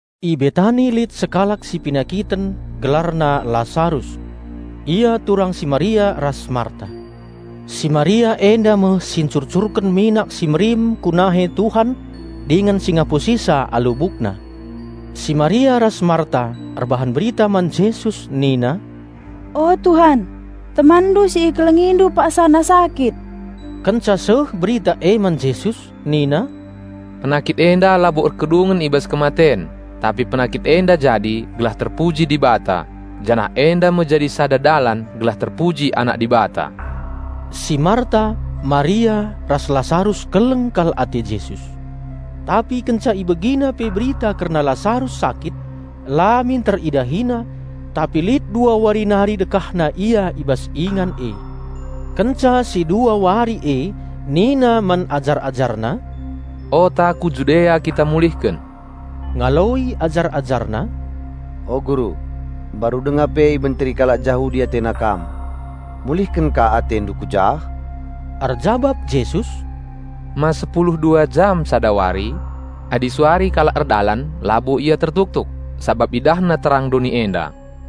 I Betani lit sekalak si penakiten, gelarna Lasarus. Ia turang si Maria ras Marta. (Si Maria enda me si ncurcurken minak si merim ku nahe Tuhan dingen si ngapusisa alu bukna.) Si Maria ras Marta erbahan berita man Jesus nina, "O Tuhan TemanNdu si IkelengiNdu paksana sakit." Kenca seh berita e man Jesus nina, "Penakit enda labo erkedungen i bas kematen; tapi penakit enda jadi gelah terpuji Dibata, janah enda me jadi sada dalan gelah terpuji Anak Dibata." Si Marta, Maria ras Lasarus keleng kal ate Jesus. Tapi kenca IbegiNa pe berita kerna Lasarus sakit, la minter IdahiNa; tapi lit dua wari nari dekahna Ia i bas ingan e. Kenca si dua wari e nina man ajar-AjarNa, "Ota ku Judea kita mulihken." Ngaloi ajar-AjarNa, "O Guru, mbaru denga pe ibenteri kalak Jahudi atena Kam; mulihken ka AteNdu ku jah?" Erjabap Jesus, "Ma sepulu dua jam sada wari? Adi suari kalak erdalan labo ia tertuktuk, sabap idahna terang doni enda.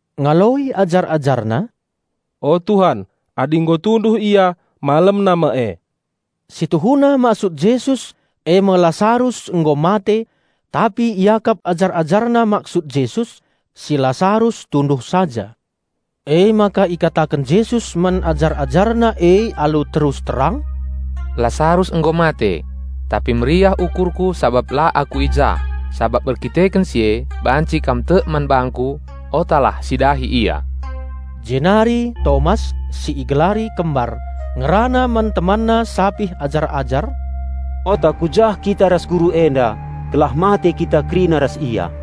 Ngaloi ajar-AjarNa, "O Tuhan, adi nggo tunduh ia, malemna me e." Si tuhuna maksud Jesus e me Lasarus nggo mate; tapi iakap ajar-AjarNa maksud Jesus si Lasarus tunduh saja. Emaka ikataken Jesus man ajar-AjarNa e alu terus terang, "Lasarus nggo mate. Tapi meriah ukurKu sabap la Aku i jah, sabap erdandanken si e banci kam tek man bangKu. Otalah si dahi ia." Jenari Tomas (si igelari Kembar) ngerana man temanna sapih ajar-ajar, "Ota ku jah kita ras Guru enda, gelah mate kita kerina ras Ia!"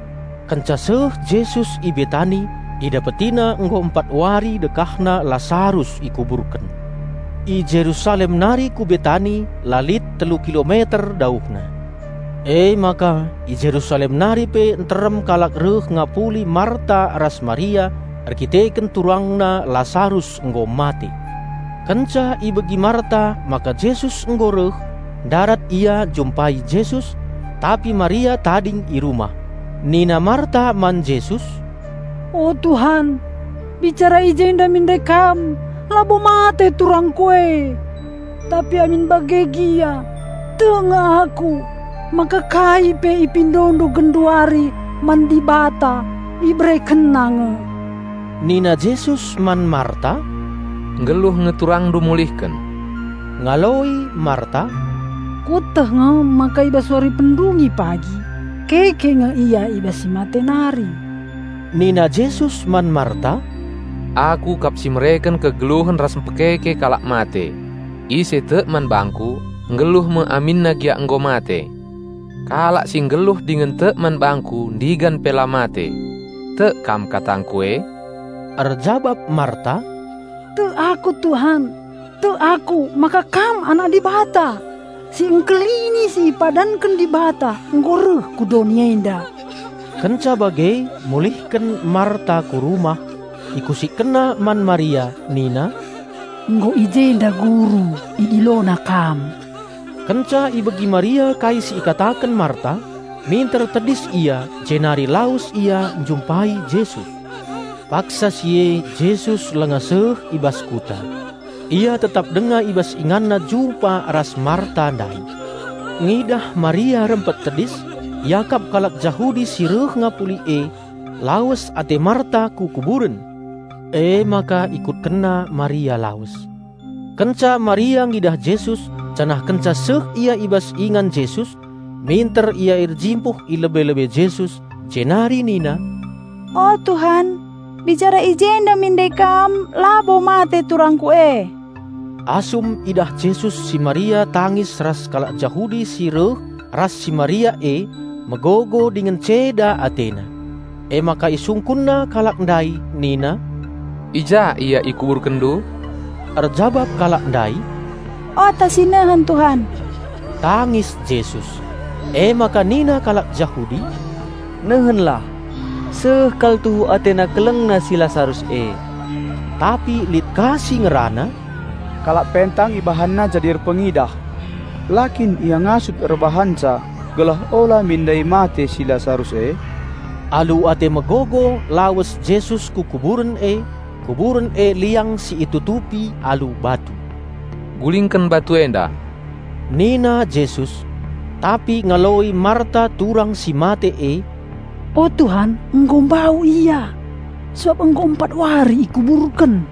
Kenca seh Jesus i Betani, IdapetiNa nggo empat wari dekahna Lasarus ikuburken. I Jerusalem nari ku Betani la lit telu kilometer dauhna. Emaka i Jerusalem nari pe nterem kalak reh ngapuli Marta ras Maria erdandanken turangna Lasarus nggo mate. Kenca ibegi Marta maka Jesus nggo reh, ndarat ia njumpai Jesus; tapi Maria tading i rumah. Nina Marta man Jesus, "O Tuhan, bicara i jenda min ndai Kam, labo mate turangku e! Tapi amin bage gia, tek nge aku maka kai pe IpindoNdu genduari man Dibata IberekenNa nge." Nina Jesus man Marta, "Nggeluh nge turangndu mulihken." Ngaloi Marta, "Kueteh nge maka i bas wari pendungi pagi keke nge Ia i bas si mate nari." Nina Jesus man Marta, "Aku kap si mereken kegeluhen ras mpekeke kalak mate. Ise tek man bangKu, nggeluh me aminna gia nggo mate. Kalak si nggeluh dingen tek man bangKu ndigan pe la mate. Tek kam katangKu e?" Erjabap Marta, "Tek aku, Tuhan! Tek aku maka Kam Anak Dibata, Si Engkelini si ipadanken Dibata nggo reh ku doni enda." Kenca bage mulihken Marta ku rumah. Ikusikkenna man Maria nina, "Nggo i jenda Guru, IdiloNandu." Kenca ibegi Maria kai si ikataken Marta, minter tedis ia jenari lawes ia njumpai Jesus. (Paksa si e Jesus langa seh i bas kuta. Ia tetap denga i bas InganNa jumpa ras Marta ndai.) Ngidah Maria rempet tedis, iakap kalak Jahudi si reh ngapuli e, lawes ate Maria ku kuburen. Emaka ikutkenna Maria lawes. Kenca Maria ngidah Jesus janah kenca seh ia i bas ingan Jesus, minter ia erjimpuh i lebe-lebe Jesus, jenari nina, "O Tuhan, bicara i jenda min ndai Kam labo mate turangku e!" Asum idah Jesus si Maria tangis ras kalak Jahudi si reh ras si Maria e megogo dingen ceda AteNa. Emaka IsungkunNa kalak ndai nina, "I ja ia ikuburkenndu?" Erjabap kalak ndai, "Ota sinehen, Tuhan." Tangis Jesus. Emaka nina kalak Jahudi, "Nehenlah, seh kal tuhu AteNa kelengna si Lasarus e!" Tapi lit ka si ngerana, "Kalak pentang IbahanNa jadi erpengidah, la kin Ia ngasup erbahanca gelah ola min ndai mate si Lasarus e?" Alu ate megogo lawes Jesus ku kuburen e; kuburen e liang si itutupi alu batu. "Gulingken batu enda!" nina Jesus. Tapi ngaloi Marta turang si mate e, "O Tuhan, nggo mbau ia, sabap nggo empat wari ikuburken!"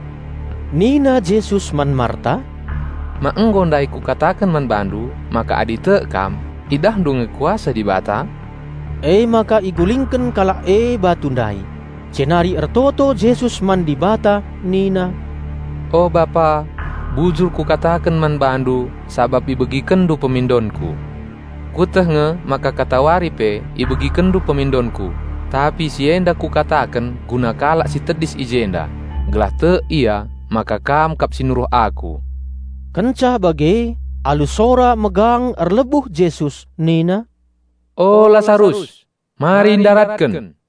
Nina Jesus man Marta, "Ma nggo ndai Kukataken man bandu maka adi tek kam idahndu nge kuasa Dibata?" Emaka igulingken kalak e batu ndai. Jenari ertoto Jesus man Dibata nina, "O Bapa, bujur Kukataken man BaNdu sabap IbegikenNdu pemindonKu. Kueteh nge maka katawari pe IbegikenNdu pemindonKu, tapi si enda Kukataken guna kalak si tedis i jenda, gelah tek Ia maka Kam kap si nuruh Aku." Kenca bage, alu sora megang erlebuh Jesus nina, "O Lasarus, mari ndaratken!"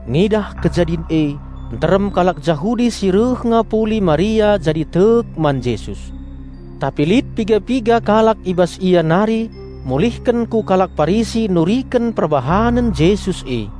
Ngidah kejadin e nterem kalak Jahudi si reh ngapuli Maria jadi tek man Jesus. Tapi lit piga-piga kalak i bas ia nari mulihken ku kalak Parisi nuriken perbahanen Jesus e.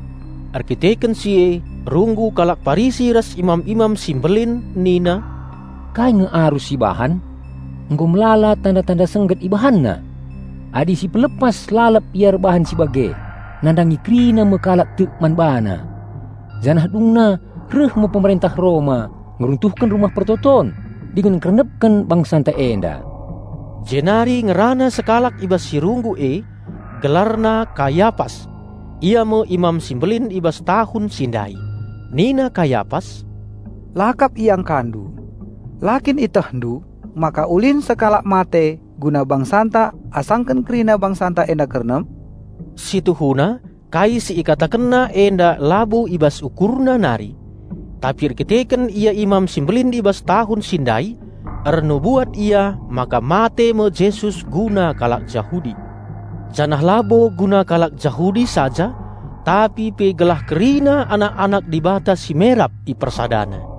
Erkiteken si e runggu kalak Parisi ras imam-imam si mbelin nina, "Kai nge arus sibahan? Nggo melala tanda-tanda sengget IbahanNa! Adi sipelepas lalap Ia erbahan si bage, nandangi kerina me kalak tek man BaNa. Janah dungna reh me Pemerentah Roma ngeruntuhken Rumah Pertoton dingen ngkernepken bangsanta enda." Jenari ngerana sekalak i bas si runggu e, gelarna Kayapas; ia me Imam si Mbelin i bas tahun si ndai. Nina Kayapas, "La kap iangkandu. La kin ietehndu maka ulin sekalak mate guna bangsanta asangken kerina bangsanta enda kernep?" Si tuhuna kai si ikatakenna enda labo i bas ukurna nari. Tapi erdandanken ia Imam si Mbelin i bas tahun si ndai, ernubuat ia maka mate me Jesus guna kalak Jahudi. Janah labo guna kalak Jahudi saja, tapi pe gelah kerina anak-anak Dibata si merap IpersadaNa.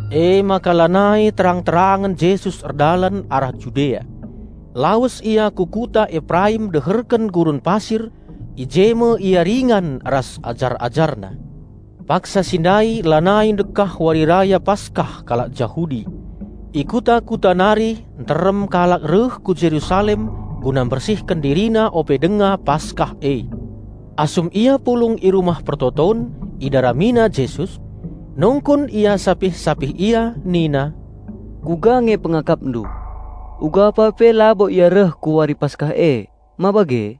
Emaka lanai terang-terangen Jesus erdalan arah Judea. Lawes Ia ku kuta Eperaim deherken gurun pasir; i je me Ia ringan ras ajar-AjarNa. Paksa si ndai lanai ndekah Wari Raya Paskah kalak Jahudi. I kuta-kuta nari nterem kalak reh ku Jerusalem guna mbersihken dirina ope denga paskah e. Asum ia pulung i Rumah Pertoton, idaramina Jesus. Nungkun ia sapih-sapih ia nina, "Kuga nge pengakapndu? Ugapa pe labo Ia reh ku wari Paskah e, ma bage?"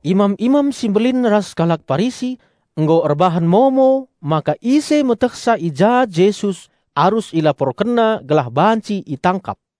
Imam-imam si mbelin ras kalak Parisi nggo erbahan momo maka ise metehsa i ja Jesus arus ilaporkenna gelah banci itangkap.